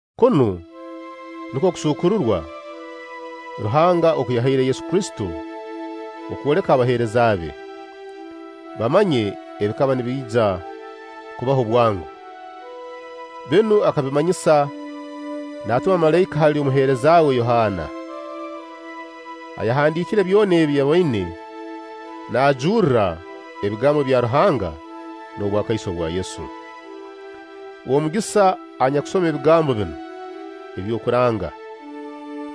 Kunu nukwo okusuukururwa Ruhanga oku yahaire Yesu Kristo kwoleka abaheereza be, bamanye ebikaba nibiija kubaho bwango. Binu akabimanyisa naatuma malaika hali omuheereza we Yohaana, ayahandiikire byona ebi yaboine naajurra ebigambo bya Ruhanga n'obwakaiso bwa Yesu. W'omugisa anyakusoma ebigambo binu eby'okuranga,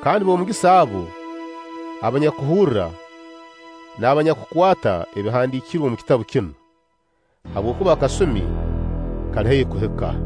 kandi b'omugisa abo abanyakuhurra n'abanyakukwata ebihandiikirwe omu kitabu kinu; habwokuba akasumi kali haihi kuhika.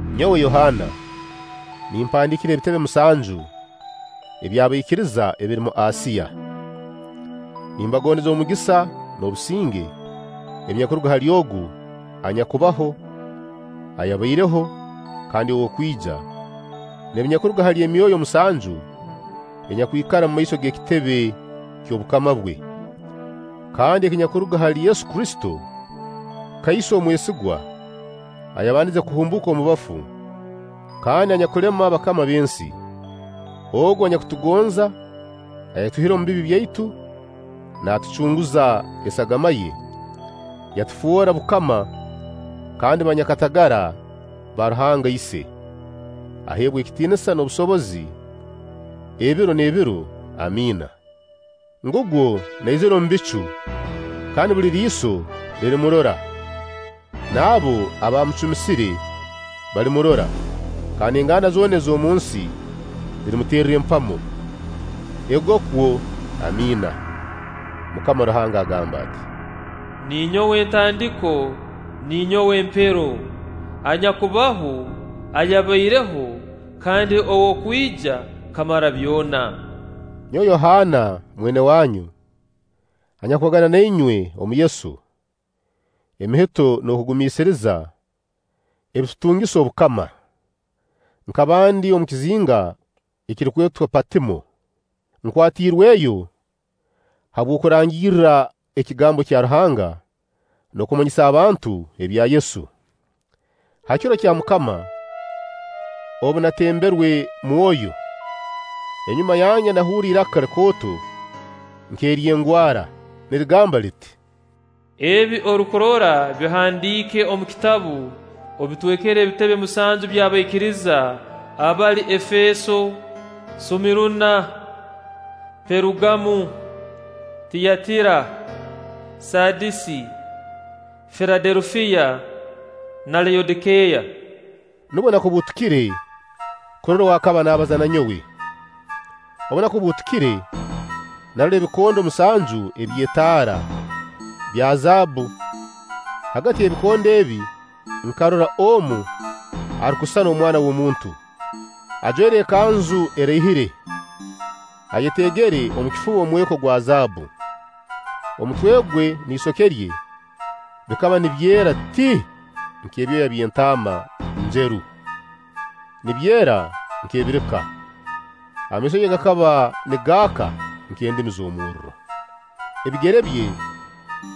Nyowe Yohaana nimpandiikira ebitebe musanju eby'abaikiriza ebiri omu Asiya: Nimbagondeza omugisa n'obusinge ebinyakuruga hali Ogu anyakubaho, ayabaireho, kandi ow'okwija, n'ebinyakuruga hali emyoyo musanju enyakwikara omumaiso g'ekitebe ky'obukama bwe, kandi ebinyakuruga hali Yesu Kristo kaiso omwesigwa ayabandize kuhumbuuka omu bafu, kandi anyakulema abakama b'ensi. Ogu anyakutugonza, ayatwihire omu bibi byaitu naatucunguza esagama ye, yatufoora bukama kandi banyakatagara ba Ruhanga Ise, aheebwe ekitiinisa n'obusobozi ebiro n'ebiro. Amiina. Ngugwo naizira omu bicu, kandi buli riiso lirimurora, n'abo abaamucumisire balimurora; kandi enganda zoona ez'omunsi zirimuterra empamo. Egokwo. Amiina. Mukama Ruhanga agamba ati: “Ninyowe Ntandiko, ninyowe Mpeero.” Anyakubaho, ayabaireho, kandi ow'okwija, Kamara-byona. Nyowe Yohaana mwene wanyu, anyakubagana na inywe omu Yesu: emihito n'okugumiisiriza ebitutungisa obukama, nkaba ndi omu kizinga ekirukwetwa Patimo, nkwatirweyo habw'okurangirra ekigambo kya Ruhanga n'okumanyisa abantu ebya Yesu. Ha kiro kya Mukama, obu natemberwe Mwoyo, enyuma yange nahurra iraka likooto nk'ery'engwara, nirigamba liti: “Ebi orukurora bihandiike omu kitabu, obitwekere ebitebe musanju by'abaikiriza abali: Efeeso, Sumiruna, Perugamo, Tiyatiira, Saadisi, Filadelufiya na Layodikeeya.” Nubwo nakubuutukire kurora ow'akaba naabaza na nyowe. Obu nakubuutukire, narora ebikondo musanju eby'etaara, bya zaabbu; hagati y'ebikondo ebi nkarora omu arukusisana Omwana w'omuntu, ajwaire ekanzu eraihire, ayeteegere omu kifuba omweko gwa zaabbu; omutwe gwe n'isoke rye bikaba nibyera ti nk'ebyoya by'entaama njeru, nibyera nk'ebirika. Amaiso ge gakaba nigaaka nk'endimi z'omurro; ebigere bye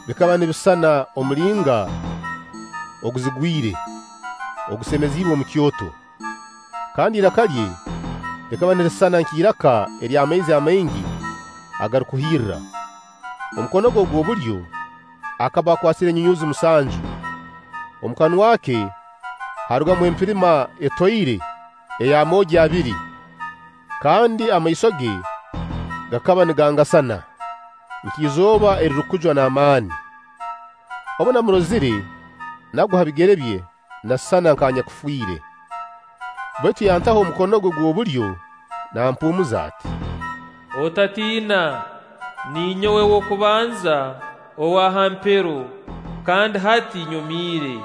bikaba nibisisana omulinga oguzigwire, ogusemereziibwe omu kyoto; kandi iraka lye likaba nirisisana nk'iraka ery'amaizi amaingi agarukuhirra; omu mukono gwe ogw'obulyo akaba akwasire enyunyuuzi musanju, omu kanwa ke haarugamu empirima etoire ey'amoogi abiri, kandi amaiso ge gakaba nigangasana nk'izooba erirukujwa n'amaani. Obu namurozire, nagwa ha bigere bye nasisana nk'anyakufiire. Baitu yantaho omukono gwe gw'obulyo, naampuumuza ati: “Otatiina, ninyowe ow'okubanza, owa ha mpero, kandi hati nyomiire.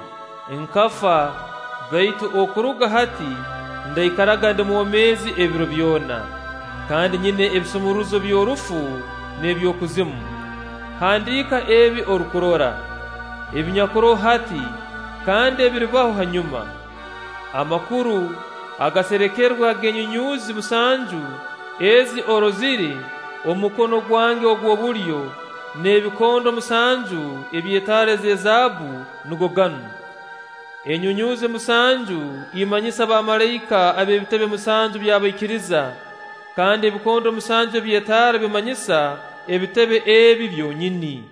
Nkafa, baitu okuruga hati ndaikaraga ndi mwomeezi ebiro byona, kandi nyina ebisumuruzo by'Orufu n'eby'Okuzimu. Handiika ebi orukurora, ebinyakuroho hati kandi ebiribaho hanyuma. Amakuru agaserekerwe ag'enyunyuuzi musanju ezi orozire omu mukono gwange ogw'obulyo, n'ag'ebikondo musanju eby'etaara eza zaabbu nugo ganu: enyunyuuzi musanju imanyisa bamalaika ab'ebitebe musanju by'abaikiriza, kandi ebikondo musanju eby'etaara bimanyisa ebitebe ebi byonyini.”